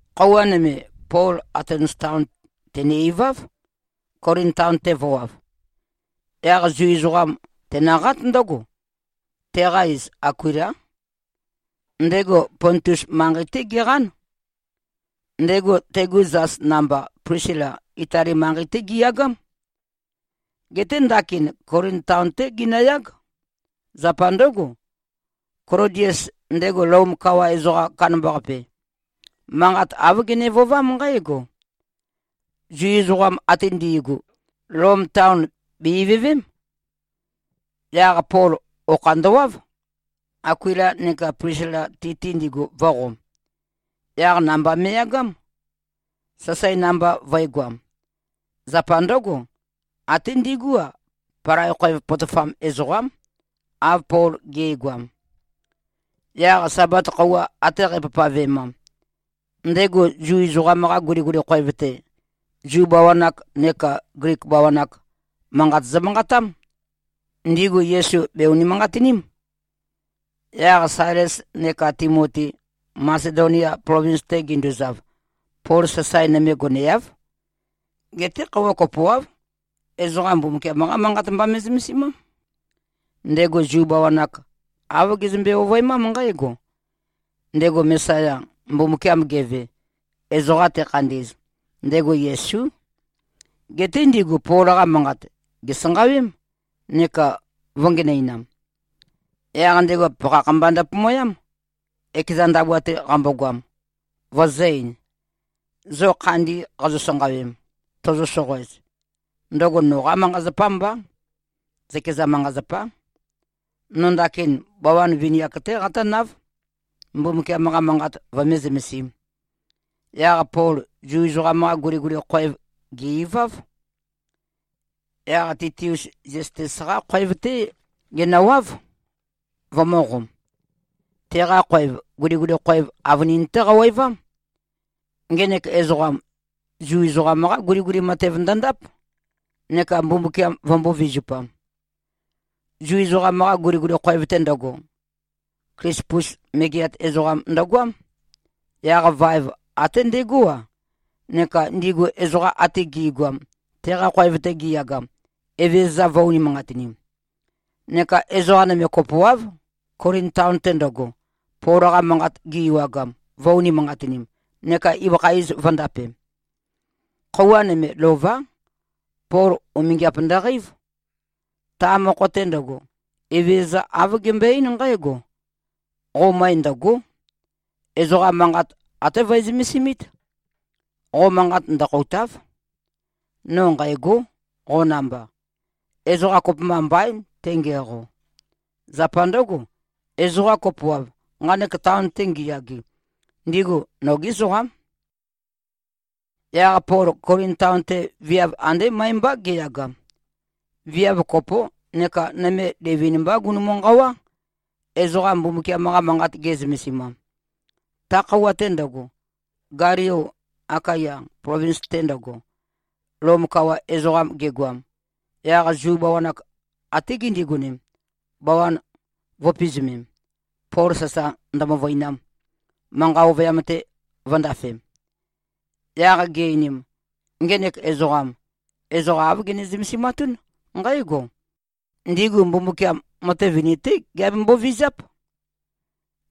Khøuwa nøme, Pol Atens taon tène-iváv, Kolin taon-te vø̄wav. Yaq Zu ezoqam tenøqát ndǿgo. Teqa iz Akuilá. Ndego Pontus manqei-té geqán. Ndego, tegu zas namba, Plisila, Itali manqei-té giyagám. Geté ndakin Kolin taon-té ginøyág. Zapa ndǿgo, Klodies, ndego Lom kawa ezoqam kandambaqape, manqat āv gene-vøovám nqǽgo: Zu ezoqam ate ndi꞉gu, Lom taon bè-ivøvém. Yaq Pol okha ndøwáv, Akuila neka Plisila, ti-te ndigu vø̄qom. Yaq namba me꞉yagám, sasae namba vø̄egoam. Zapa ndǿgo, até ndigú-a, palai khoev potofam ezoqám, av Pol ge꞉goam. Yaq Sabat khøuwa ate qæpavpavemam, ndego Zu ezoqam-qa guliguli khoev-te, Zu bawan-ak nekā Glik bawan-ak, manqat zømanqatám. Ndigu Yesu bè-unimanqatiním. Yaq Sailes neka Timoti Masedonia plovins-te ginduzav, Pol sasae nøme goneáv. Geté khøuwa kopoáv, ezoqa Mbumbukiam-qá Manqat mba me꞉zømesimám. Ndego Zu bawan-ak āv gezømbe-ovøemám nqǽgo: Ndego Mesaya, Mbumbukiam geve, ezoqa tekhandi꞉z, ndego Yesú. Geté ndigu Pol-qa manqat, gèsanqawém, neka vø̄ngenøinam. Yaq ndego pakhakh mba ndøpomoyám, ekeza ndabua-te qambogoam, vøzø̄-ein, “Zo khandi qazo-sanqawem, tozo-soqoez, ndøgo noqá manqa-zapá mbá. Zøkeza manqa-zapá. No ndakin bawan vini-ak-té qatǿnáv, Mbumbukiam-qa manqat vømé-zømesīm.” Yaq Pol Zu ezoqam-qa guliguli khoev gè-iváv. Yaq Titius Ziastes-qá khoev-té genøwáv, vømø̄qom. Teqa khoev, guliguli khoev avønin-té qawevám. Ngenek ezoqam, Zu ezoqam-qá guliguli matev ndøndáp, neka Mbumbukiam vømbō-vizupam. Zu ezoqam-qa guliguli khoev-te ndøgo, Klispus megeat ezoqam ndøgoám. Yaq vaev, até ndegó-a, neka ndigu ezoqa ate gi꞉goam, teqa khoev-te gi꞉yagam, Evezøza vø̄-unimanqatinim. Neka ezoqa nøme kopoáv, Kolin taon-te ndøgo, Pol-qa manqat gi-ewagam, vø̄-unimanqatinim, neka ibøkha iz vø̄ndapem. Khøuwa nøme, lová, Pol umingiap ndøqeív. Ta mokho-te ndøgo, Evezøza āv gembøe-eín nqǽgo, “Qo møe ndø̀go᷄. Ezoqa manqat até vøe-zømesimít. Qo manqat ndøkhoùta᷄v. No nqæ̂gó, qo namba. Ezoqa kopømba mbaín, tengiæqo. Zapa ndǿgo, ezoqa kopoáv, nqanek taon-te ngiyage, ndigu nogí ezoqám.” Yaq Pol Kolin taon-te viav andé møe-mbá geyagam. Viav kopó neka nøme livin-mbá gunumu-nqawá, ezoqa Mbumbukiam-qa Manqat ge꞉zømesimam. Ta khøuwa-te ndøgo, Galio Akaya plovins-te ndøgo, Lom kawa ezoqam gegoam, yaq Zu bawan-ak até gindigonem, bawan vø̄pizumem, Pol sasa ndømøvøinam, manqa ovøyam-te vø̄ndafem Yaq gi-einim, “Ngenek ezoqam, ezoqa āv gene-zømesimatún nqǽgo: Ndigu Mbumbukiam matev vini-té giabembo-vizáp.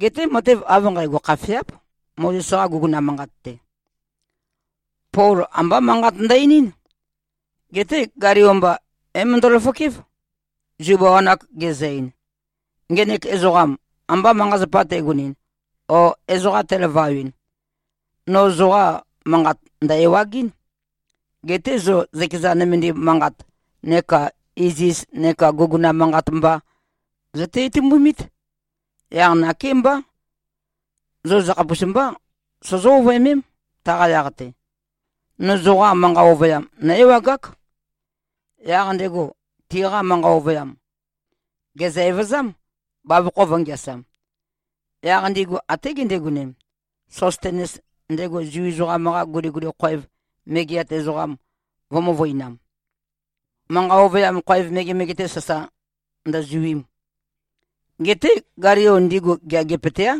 Geté matev av nqægo khafeáp, Mozes-qa guguna manqat-te.” Pol ambá manqat ndø-einín. Geté Galio mba, é-møndo꞉-løfokév, Zu bawan-ak gezø-ein, “Ngenek ezoqam amba manqa-zapa tegonɨn o ezoqa telavawɨn, no zoqa manqat ndæ̀-ewagɨ́n. Geté zo zøkeza nømendim manqat neka iziz neka guguna manqat mba zøte-itumbumít. Yaq nakémbá, zo zøkhapus mbá sozó-ovøemém, taqa yaq-te. No zoqa manqa ovøyam, nǿ-ewagák.” Yaq ndego tiqa manqa ovøyam, gèzø-evøzám, bavokho vø̄ngeasam. Yaq ndigu até gindigonem, Sostenes, ndego Zu ezoqam-qa guliguli khoev megeat ezoqam vø̄-møvøinam, manqa ovøyam khoev megemege-te, sasa ndøzuim. Geté Galio ndigu geagipøteáv.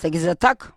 Sègezøták.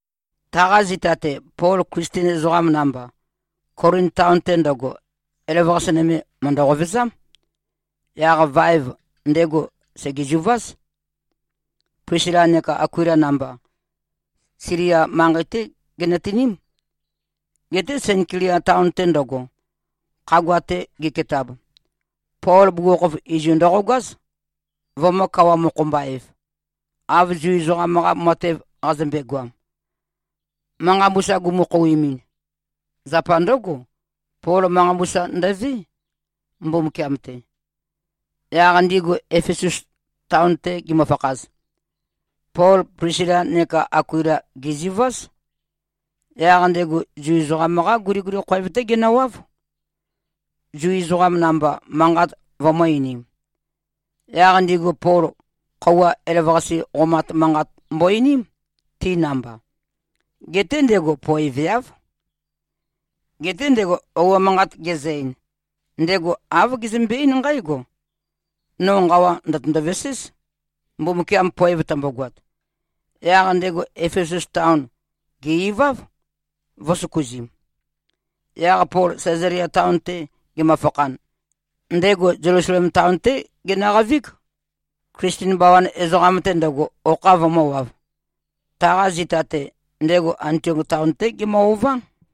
Taqa zita-te, Pol Klisten ezoqam namba, Kolin taon-te ndøgo, elavøqase nøme, mø̀ndø-qovezám. Yaq vaev, ndego sègezuváz, Plisila neka Akuila namba. Silia manqei-té ginøtiním. Geté Senklia taon-te ndøgo, khagua-te giketab, Pol bugukhokhof izu ndøqogáz, vømø̄-kawa-mokho-mba-ev, av Zu ezoqam-qa matev qazømbe-goam, manqa mbusa gumu-khouimin. Zapa ndǿgo, Pol manqa mbusa ndøvé, Mbumbukiam-te. Yaq ndigu Efesus taon-te gimøfakhaz, Pol Plisila neka Akuila gèzuváz. Yaq ndego Zu ezoqam-qá guliguli khoev-té genøwáv, Zu ezoqam namba manqat vømø̄-einim. Yaq ndigu Pol, khøuwa elavøqase qomat manqat mbo-einím, ti namba. Geté ndego poeveáv. Geté ndego ouo manqat gezø-ein, ndego āv gezømbe-eín nqǽgo, “No nqawa ndø̀tøndo-veséz, Mbumbukiam poev tømbogoat.” Yaq ndego Efesus taon, gè-iváv, vø̄søkuzim. Yaq Pol Sæzalia taon-te gemøfakhan, ndego Zelusalem taon-té genøqavíg, Klisten bawan ezoqam-te ndøgo, okha vømø̄wav. Taqa zita-te, ndego Antiok taon-té gemø-ová.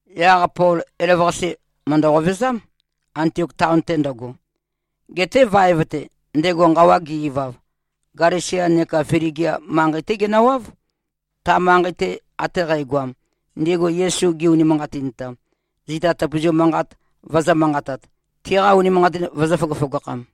Yaq Pol elavøqase mø̀ndø-qovezám, Antiok taon-te ndøgo. Geté vaev-te, ndego nqawa ge-ivav, Galesia neka Fligia manqei-té genøwáv, ta manqei-te ate qægoam, ndigu Yesu gi-unimanqatintam, zita tøpøzu manqat vøzø̄-manqatat, tiqa unimanqatin vøzø̄-føgøføgakham.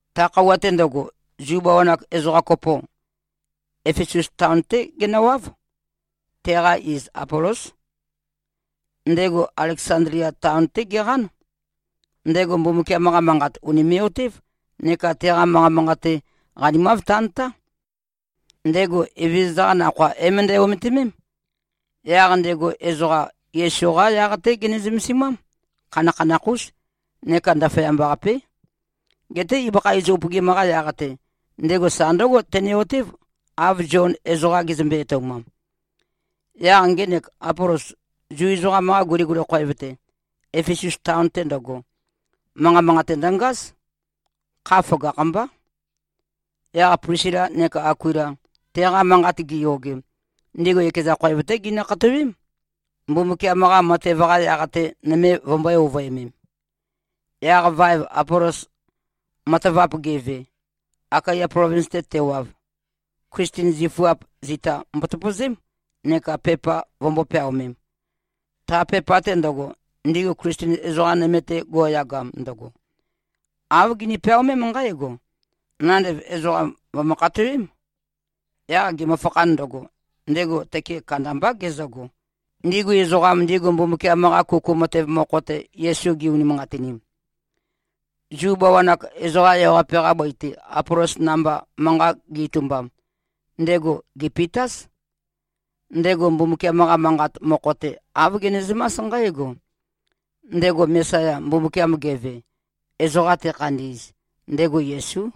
Ta khøuwa-te ndøgo, Zu bawan-ak ezoqa kopo, Efesus taon-té genøwáv. Teqa iz Apolós. Ndego Aleksandlia taon-té geqán. Ndego Mbumbukiam-qa Manqat ùnime꞉-otév neka teqa manqa manqate qanimav tantáv. Ndego Evezøza-qa Nakhoa é-møndæ-ometimém. Yaq ndego ezoqa, Yesu-qa yaq-té gene-zømesimám. Khanakhanakh-ús neka ndaføyamba-qapé. Geté ibøkha iz upøgim-qa yaq-te, ndego sa ndǿgo tene-otév, av Zion ezoqa gezømbe-etoumam. Yaq ngenek Apolos, Zu ezoqam-qa guliguli khoev-te, Efesus taon-te ndøgo, manqa manqate ndøngáz. Kha føgakh-mbá. Yaq Plisila neka Akuila, teqa manqat giyogem, ndigu ekeza khoev-té ginø-khatowém, Mbumbukiam-qa matev-qa yaq-te, nøme vømbø̄e-ovøemem. Yaq vaev Apolos matavap geve, Akaya plovins-te tewav, Klisten zifuap, zita mbotøpøzém, neka pepa vømbō-peaomem. Ta pepa-te ndøgo, ndigu Klisten ezoqa nøme-te, go꞉yagam ndøgo, āv gini-peaomém nqǽgo, “Nandev ezoqam, vø̀mø-khatowém.” Yaq gemøfakhan ndøgo, ndego tøke kandambá gezøgo, ndigu ezoqam, ndigu Mbumbukiam-qa kuku matev mokho-te, Yesu gi-unimanqatinim. Zu bawan-ak, ezoqa ewaqape-qa bøi-te, Apolos namba manqa gi-itumbam, ndego gèpitáz. Ndego Mbumbukiam-qa Manqat mokho-te, āv genezømás nqǽgo: Ndego Mesaya, Mbumbukiam geve, ezoqam tekhandi꞉z, ndego Yesú.